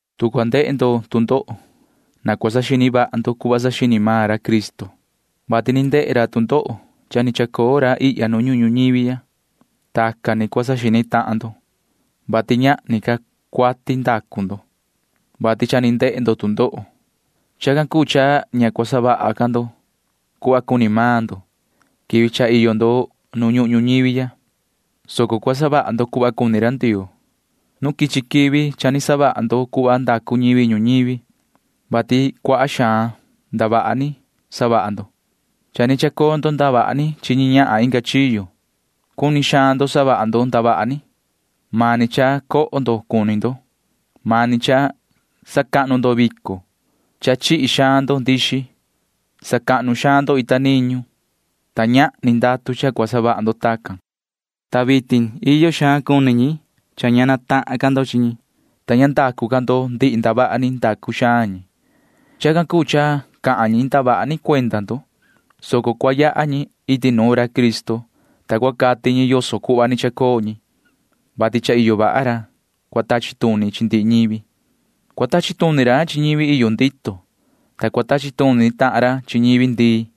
Tu cua ndehe ndo tu ndoho, na cua saxini vaha ndo cuhva saxini maan ra Cristo, vati ndehe ra tu ndoho cha ni chacoo ra ihya nu ñuhun ñuñivi ya. Tacan ni cua saxini tahan ndo, vati ñahni ca cuati ndacu ndo, vati cha ni ndehe ndo tu ndoho. Chacan cuu cha ña cua savaha ca ndo cuhva cuni maan ndo quivi cha iyo ndo nu ñuhun ñuñivi ya, soco cua savaha ndo cuhva cuni ra Ndioo. Nu quichi quivi cha ni savaha ndo cuhva cuni ñivi ñuñivi. Tacan ni cua ndoo chi, vati cuaha xaan ndavaha ni savaha ndo. Cha ni chacoo ndo ndavaha ni chi ñi ñahan inga chiyo. Cuni xaan ndo savaha ndo ndavaha ni. Mani cha coho ndo cuni ndo. Mani cha sacahnu ndo vico. Cha chihi xaan ndo ndixi. Sacahnu xaan ndo ita niñu, ta ñahni ndatu cha cua savaha ndo tacan. Ta vitin iyo xaan cuni ñi cha ña chahan ca ndo chi ñi, ta ña ndacu ca ndo ndihi ndavaha ni ndacu xaan maan ñi. Chacan cuu cha cahan ñi ndavaha ni cuenda ndo, soco cua yaha ñi iti nuun ra Cristo, ta cua cati ñi yoso cuhva ni chacoo ñi, vati cha iyo vaha ra cua tachi tuni chi ndihi ñivi. Cua tachi tuni ra chi ñivi iyo ndito, ta cua tachi tuni tahan ra chi ñivi ndii.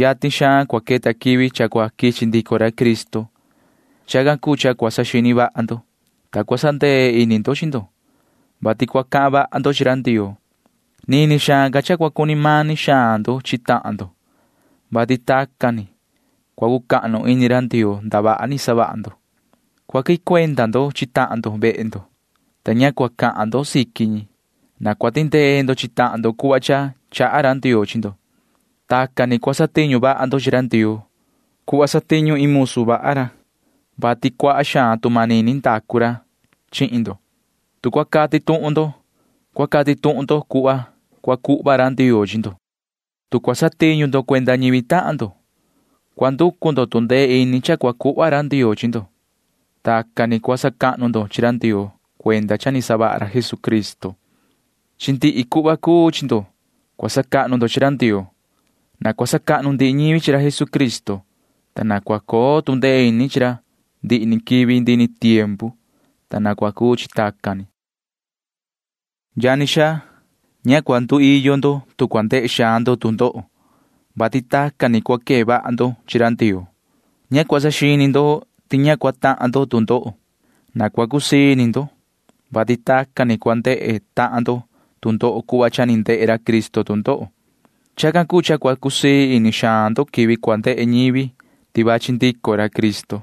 Yatin xaan cua queta quivi cha cua quichi ndico ra Cristo. Chacan cuu cha cua saxini vaha ndo, ta cua sandee ini ndo chi ndo, vati cua cahan vaha ndo chi ra Ndioo. Nini xaan ca cha cua cuni mani xaan ndo chi tahan ndo, vati tacan ni cua cucahnu ini ra Ndioo ndavaha ni savaha ndo. Cua quihin cuenda ndo chi tahan ndo vehe ndo, ta cua cusii ini ndo chi ñi. Na cua tindee ndo chi tahan ndo cuhva cha chaha vaha ra Ndioo chi ndo. Tacan ni cua satiñu vaha ndo chi ra Ndioo cuhva satiñu iin musu vaha ra, vati cuaha xaan tu manini chaha xaan ra chihin ndo. Tu cua cati tuhun ndo, cua cati tuhun ndo cuhva cua cuhva ra Ndioo chi ndo. Tu cua satiñu ndo cuenda ñivi tahan ndo, cua nducu ndo tu ndee ini cha cua cuhva ra Ndioo chi ndo. Tacan ni cua sacahnu ndo chi ra Ndioo cuenda cha ni savaha ra Jesucristo. Chi ndihi cuii cuhva cua sacahnu ndo chi ra Ndioo. Na cua sacahnu ndihi ñivi chi ra Jesucristo, ta na cua coo tu ndee ini chi ra ndihi ni quivi ndihi ni tiempu. Na cua cuu chi tacan ni. Yani xaa, ña cua nduiyo ndo nu cua ndehe xaan ndo tu ndoho, vati tacan ni cua quee vaha ndo chi ra Ndioo. Ña cua saxini ndo ti ña cua tahan ndo tu ndoho. Na cua cusii ini ndo, vati tacan ni cua ndehe tahan ndo tu ndoho cuhva cha ni ndehe ra Cristo tu ndoho. Chacan cuu cha cua cusii ini xaan ndo quivi cua ndehe ñivi ti vachi ndico ra Cristo,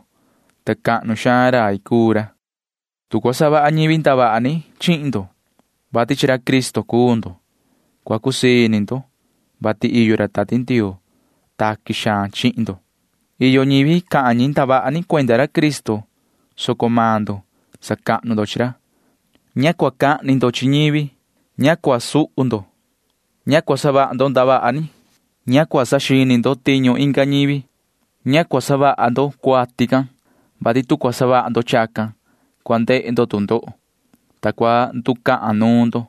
ta cahnu xaan rai cuu ra. Tu cua savaha ñivi ndavaha ni chihin ndo, vati chi ra Cristo cuu ndo, cua cusii ini ndo. Cua cusii ini ndo, vati iyo ra Tati Ndioo ra taqui vaha chihin ndo. Maan ñivi cahan ndavaha ni cuenda ra Cristo, soco maan ndo sacahnu chi ra. Ña cua cahni ndo chi ñivi. Ña cua suhu ndo. Ña cua savaha ndo ndavaha ni. Ña cua saxini ndo tiñu inga ñivi. Na ña cua savaha ndo cuati can, vati tu cua savaha ndo chacan, cua ndehe ndo tu ndoho, ta cua nducahan nuun ndo.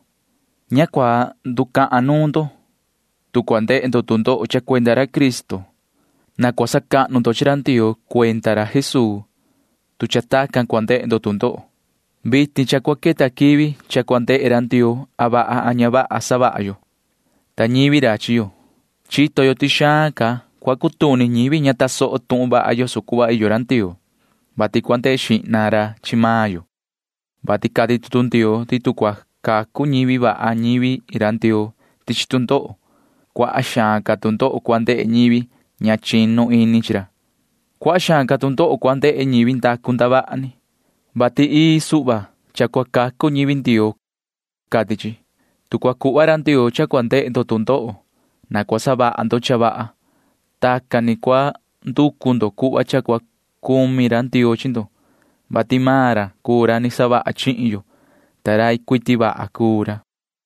Ña cua nducahan nuun ndo, tu cua ndehe ndo tu ndoho cha cuenda ra Cristo. Na cua sacahnu ndo chi ra Ndioo cuenda ra Jesuu, tu cha tacan cua ndehe ndo tu ndoho. Vitin cha cua queta quivi cha cua ndehe ra Ndioo a vaha a ña vaha savaha maan yo, ta ñivi ra chi yo. Chito yo ti xaan ca cua tahan ñivi ña tasoho tuhun vaha yoso cuhva iyo ra Ndioo, vati cua ndehe xihna ra chi maan yo, vati cati tutu Ndioo ti tu cua cacu ñivi vaha ñivi Ndioo chi tu ndoho, cuaha xaan ca tu ndoho cua ndehe ñivi ña chinu ini chi ra. Cuaha xaan ca tu ndoho cua ndehe ñivi ndacu ndavaha ni, vati ii suhva cha cua cacu ñivi Ndioo, cati chi. Tu cua cuhva ra Ndioo cha cua ndehe ndo tu ndoho, na cua savaha ndo cha vaha. Tacan ni cua nducu ndo cuhva cha cua cumi ra Ndioo chi ndo, vati maan ra cuu ra ni savaha chihin yo, ta rai cuiti vaha cuu ra.